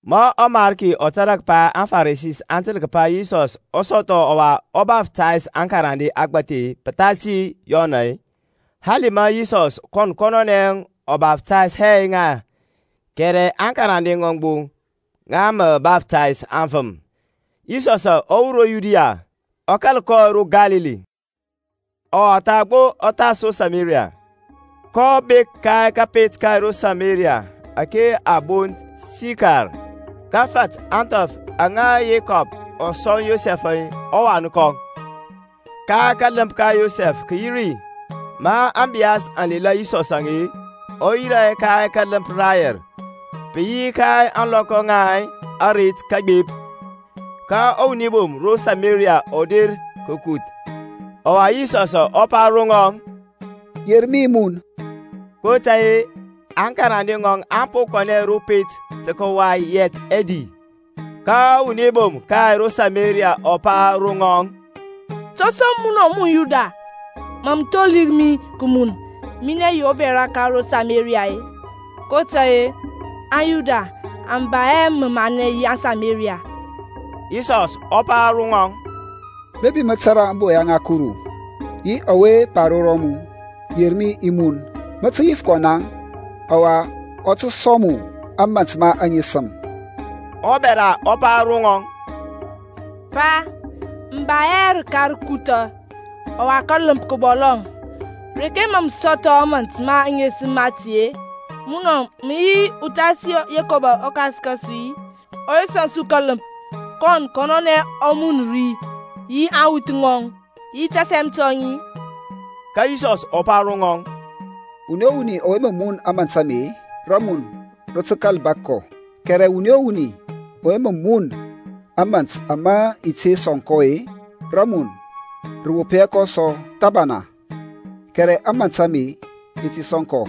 Ma ɔMarki ɔ tȧrȧ kəpa aŋFarisi aŋ təl kəpa Yisɔsȧŋ ɔ sɔthɔ ɔwa ɔ baftays akarande agbȧthi pəthasi Yɔnȧŋ, hali ma Yisɔsȧŋ kɔn kɔnɔnɛ ɔ baftays hɛ ŋa, kɛrɛ aŋkarande ŋɔŋ gbo ŋa mə baftays aŋfəm, Yisɔsȧŋ ɔ wur ro Yudia, ɔ kȧl kɔ ro Kalili. Ɔwa tha gbo ɔ thas ro Samaria. kɔ bek ka kȧpet ka ro Samaria ȧke a bont Sikar, kə fat ȧŋthɔf aŋa Yekɔb-əŋ ɔ sɔŋ Yosɛf-əŋ ɔwan kɔŋ. Kȧləmp ka Yekɔb kə yi ri. Ma ȧŋbiyas aŋ lela Yisɔsȧŋ, ɔ yirȧ ka kȧləmp rayɛr: pə yi ka ȧŋlɔkɔ ŋa aret kəgbep. Ka wuni bom ka ro Samaria ɔ der tə kəkuth: ɔwa Yisɔsȧŋ ɔ pa ro ŋɔŋ, Yer mi i mun. kotȧy-e aŋkarande ŋɔŋ aŋ po kɔnɛ ro pet tə kəway yɛt ɛdi. Ka ɔwuni bom ka ro Samaria ɔ pa ro ŋɔŋ, To som munɔ mun Yuda mȧ mə tholir mi kəmun, minɛ yi ubɛra ka ro Samaria-e? (kotȧy-e aŋYuda aŋ ba hɛ məmanɛ yi aŋSameriya). Yisɔsȧŋ ɔ pa ro ŋɔŋ, Bepi mə tȧrȧ ȧŋboya ŋa Kuru, yi ɔwe pa ro mu, Yer mi i mun, mə tə yif kɔ naŋ, ɔwa ɔ tə sɔŋ mu ȧmȧnt ma aŋesəm. Ɔbɛra ɔ pa ro ŋɔŋ, Pa, mə ba hɛ rəka rəkuthȧ, ɔwa kȧləmp kə bɔlɔŋ: reke mȧ mə sɔthɔ ȧmȧnt ma aŋesəm mati-e? Munɔ mə yi uthasi Yekɔb ɔkas ka su-i, ɔwe sɔŋ su kȧləmp, kɔn kɔnɔnɛ ɔ mun ri, yi aŋwuth ŋɔŋ, yi tasɛm tɔŋ-i? Ka Yisɔs ɔ pa ro ŋɔŋ, Wuni o wuni ɔwe mə mun ȧmȧnt ame-e, rəmun rə tə kȧl wop kɔ: kɛrɛ wuni o wuni ɔwe mə mun ȧmȧnt ama i ti sɔŋ kɔ-e, rəmun rə wop hɛ kɔ sɔ thəbana; kɛrɛ ȧmȧnt ama i ti sɔŋ kɔ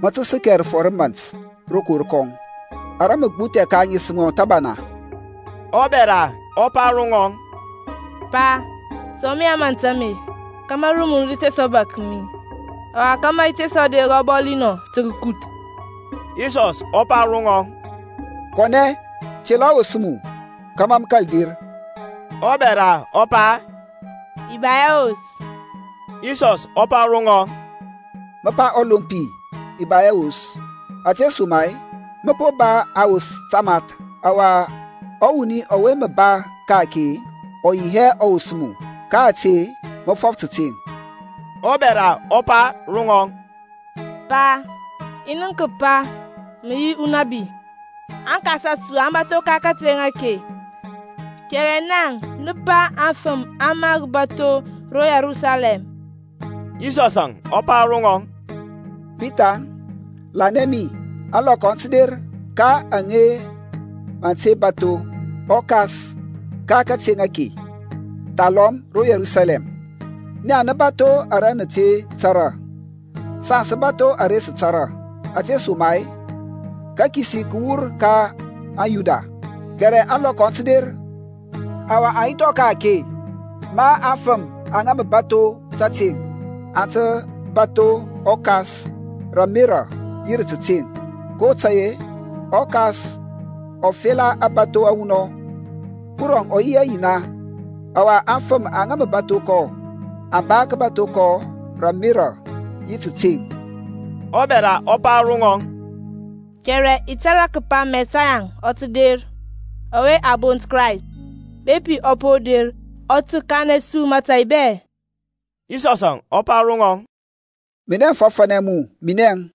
mə tə səkɛ rəfɔr ra mȧnt rokor kɔŋ, ara mə gbuthɛ ka aŋesəm thəbana. Ɔbɛra ɔ pa ro ŋɔŋ, Pa, sɔŋ mi ȧmȧnt ame, kȧmȧ rəmun rə te sɔ bȧk mi, ɔwa kȧmȧ i te sɔ der ɔbɔli anɔ tə kəkuth. Yisɔsȧŋ ɔ pa ro ŋɔŋ, Kɔnɛ, tela ɔwos mu, kȧmȧ mə kȧl der. Ɔbɛra ɔ pa, I ba hɛ wos. Yisɔsȧŋ ɔ pa ro ŋɔŋ, Mə pa ɔlompi, I ba hɛ wos: ȧtesoma-e mə po ba awos tamath: ɔwa ɔwuni ɔwe mə ba ka-ake ɔ yi hɛ ɔwos mu: ka ȧte mə fɔf tȧteŋ. Ɔbɛra ɔ pa ro ŋɔŋ, Pa, i nənk kəpa mə yi unabi. Aŋkas a su aŋ bȧtho ka kateŋ ake; kɛrɛ naŋ nə pa afəm aŋ mar bȧtho ro Yerusalɛm. Yisɔsȧŋ ɔ pa ro ŋɔŋ, Bithaŋ, lanɛ mi, ȧŋlɔkɔ aŋ tə der, ka aŋa mə nə te bȧtho ɔKas ka kateŋ ake, thalɔm ro Yerusalɛm. Naŋ nə bȧtho ara nə te tȧrȧ: saŋ sə bȧtho ara sə tȧrȧ, ȧtesoma-e kəkisi kə wur ka aŋYuda. Kɛrɛ ȧŋlɔkɔ aŋ tə der, ɔwa aŋ yi thɔŋ ka-ake, ma afəm aŋa mə bȧtho tȧteŋ aŋ tə bȧtho ɔKas rə ȧmerȧ yi rə tȧteŋ: kotȧy-e ɔKas ɔ fela ȧŋbȧtho awunɔŋ. Kurɔŋ ɔ yi ɔYina: ɔwa aŋfəm aŋa mə bȧtho kɔ aŋ ba kəbatho kɔ rə ȧmerȧ yi rə təteŋ. Ɔbɛra ɔ pa ro ŋɔŋ, I tȧrȧ kəpa Mɛsayaŋ ɔ tə der, ɔwe a bont Krayst; bepi ɔ po der ɔ tə kanɛ su mȧtȧy bɛ. Yisɔsȧŋ ɔ pa ro ŋɔŋ, Minɛ mə fɔfȧnɛ mu, minɛŋ.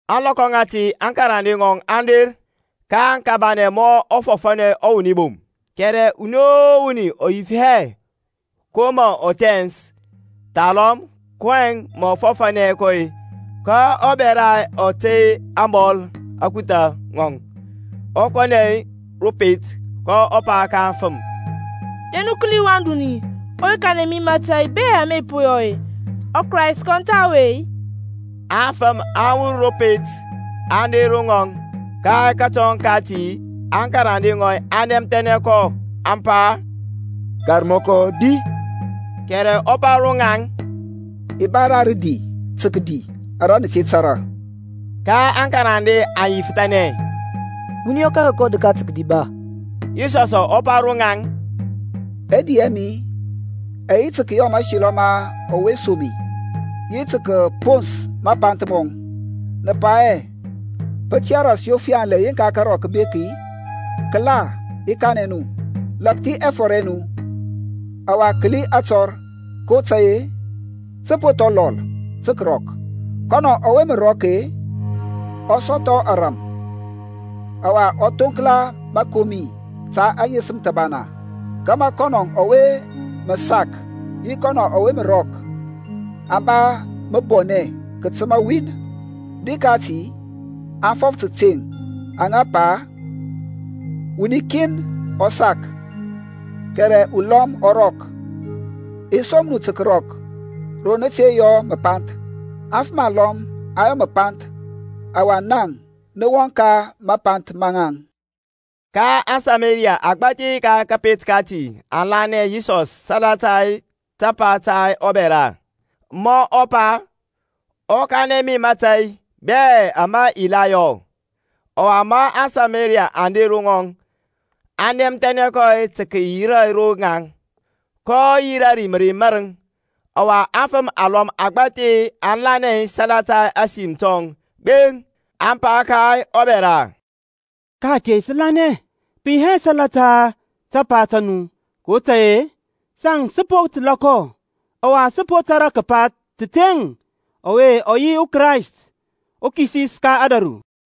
Ȧŋlɔkɔ ŋati aŋkarande ŋɔŋ aŋ der, kaŋ kabanɛ mɔ mɔ fɔfȧnɛ ɔwuni bom: kɛrɛ wuni o wuni ɔ yif hɛ, Ko mȧ mə thɛns-e, thalɔm, kɔyɛŋ mȧ mə fɔfȧnɛ kɔ-e? Ka ɔbɛra ɔ tey ȧŋbɔl akutha ŋɔŋ, ɔ kɔnɛ ro pet, ɔ pa ka aŋfəm, Der nu kəli wan duni ɔwe kanɛ mi mȧtȧy bɛ ama i po yɔ-e, ɔKrayst kɔn tha ɔwe-i? Aŋfəm aŋ wur ro pet, aŋ der ro ŋɔŋ. Ka kətɔŋ kati, aŋkarande ŋɔŋ aŋ nɛmthɛnɛ kɔ, aŋ pa, Karmɔkɔ di. Kɛrɛ ɔ pa ro ŋaŋ, I ba ra rədi tə kədi ara nə te tȧrȧ. Ka aŋkarande aŋ yifəthanɛ, Wuni ɔ kȧrȧ kɔ rəka tə kədi ba? Yisɔsȧŋ ɔ pa ro ŋaŋ, Ɛdi ɛ mi ɛ yi tə kəyɔ mȧselɔ ma ɔwe som mi, yi tə kəpons mapanth mɔŋ. Nə pa hɛ, Pə tiyȧ ras yof yanlɛ yeŋka karɔk kə bek-i? Kəla, i kanɛ nu, Lȧkthi ɛfɔr ɛ nu, ɔwa kəli atɔr; kotȧy-e tə po thɔ lɔl tə kərɔk. Kɔnɔ ɔwe mə rɔk-e ɔ sɔthɔ ȧŋrȧm, ɔwa ɔ thoŋkla məkomi ta aŋesəm thəbana: kȧmȧ kɔnɔ ɔwe mə sak yi kɔnɔ ɔwe mə rɔk aŋ ba məbɔnɛ kətəma win. Di kati aŋ fɔf tȧteŋ aŋa pa, Wuni kin ɔ sak, kɛrɛ ulɔm ɔ rɔk. I som nu tə kərɔk ro nə te yɔ məpanth: afəm alɔm aŋ yɔ məpanth ɔwa naŋ nə wɔŋ ka mapanth ma ŋaŋ. Ka aSamariya agbȧthi ka kȧpet kati aŋ lanɛ Yisɔsȧŋ salata tapa ta ɔbɛra, ma ɔ pa, Ɔ kanɛ mi mȧtȧy bɛ ama i la yɔ. Ɔwa ma aŋSameriya aŋ der ro ŋɔŋ, aŋ nɛmthɛnɛ kɔ tə kəyira ro ŋaŋ, kɔ yirȧ ri mərey mȧrəŋ. Ɔwa afəm alɔm agbȧthi aŋ lanɛ salata ȧsim tɔŋ gbeŋ; aŋ pa ka ɔbɛra, Ka ake sə lanɛ, pə yi hɛ salata tapa ta mu; kotȧy-e saŋ sə po təlȧ kɔ, ɔwa sə tȧrȧ kəpa təteŋ ɔwe ɔ yi ɔKrayst ɔKisis ka ȧdȧru.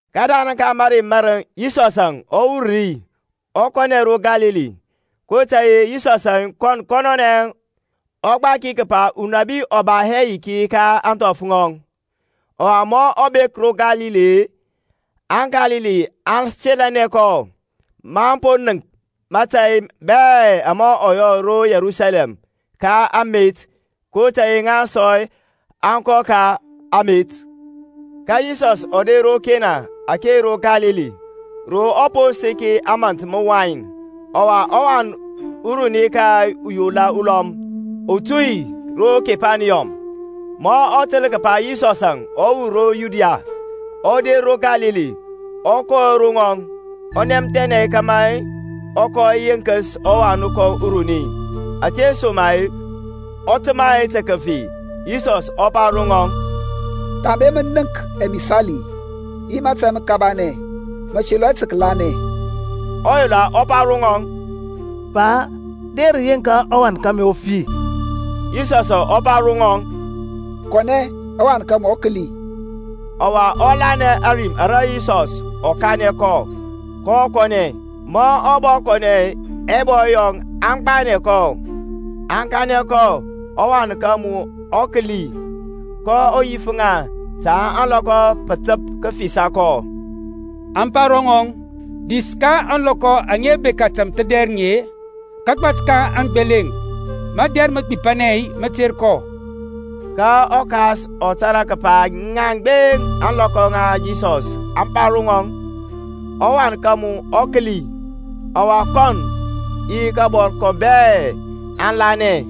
Kədarəŋ ka mərey mȧrəŋ Yisɔsȧŋ ɔ wur ri ɔ kɔnɛ ro Kalili. kotȧy-e Yisɔsȧŋ kɔn kɔnɔnɛ ɔ gbaki kəpa unabi ɔ ba hɛ yiki ka ȧŋthɔf ŋɔŋ. Ɔwa ma ɔ bek ro Kalili-e, aŋKalili aŋ selənɛ kɔ, maŋ po nənk mȧtȧy bɛ ama ɔ yɔ ro Yerusalɛm ka amet, kotȧy-e ŋa sɔ aŋ kɔ ka amet. Ka Yisɔsȧŋ ɔ der ro Kena ake ro Kalili, ro ɔ po səki ȧmȧnt məwain. Ɔwa wan uruni ka uyola ulɔm, ɔ tu ro Kepaniyɔm. Ma ɔ təl kəpa Yisɔsȧŋ ɔ wur ro Yudia ɔ der ro Kalili, ɔ kɔ ro ŋɔŋ, ɔ nɛmthɛnɛ kȧmȧ ɔ kɔ yenkəs ɔwan kɔŋ uruni: ȧtesoma-e ɔ təmȧ tə kəfi. Yisɔsȧŋ ɔ pa ro ŋɔŋ, Thambe mə nənk ɛmisali yi mȧtȧy məkabanɛ, mə selɔ hɛ tə kəlanɛ. Ɔyola ɔ pa ro ŋɔŋ, Pa, der yeŋka ɔwan kȧmi ɔ fi. Yisɔsȧŋ ɔ pa ro ŋɔŋ, Kɔnɛ, ɔwan ka mu ɔ kəli. Ɔwa ɔ lanɛ ȧrim ara Yisɔs ɔ kanɛ kɔ, kɔ kɔnɛ. Ma ɔ bɔ kɔnɛ ɛbɔy yɔŋ aŋ gbanɛ kɔ, aŋ kanɛ kɔ, Ɔwan ka mu ɔ kəli. kɔ yif ŋa ta ȧŋlɔkɔ pə təp kəfisa kɔ. Aŋ pa ro ŋɔŋ, Dis ka ȧŋlɔkɔ aŋa bekȧ tȧmthədɛrəŋ ka kagbat ka aŋgbeleŋ, madɛr məgbipanɛ mə ter kɔ. Ka ɔkas ɔ tȧrȧ kəpa ŋiəŋ gbeŋ ȧŋlɔkɔ aŋa Yisɔsȧŋ ɔ pa ro ŋɔŋ, Ɔwan ka mu ɔ kəli; ɔwa kɔnɔŋ yi kabɔr kɔŋ bɛ aŋ lanɛ.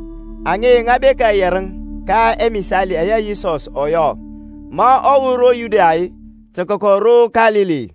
Aŋe ŋa bekȧ yɛrəŋ ka ɛmisali ɛyɛ Yisɔsȧŋ ɔ yɔ, ma ɔ wur ro Yudia tə kəkɔ ro Kalili.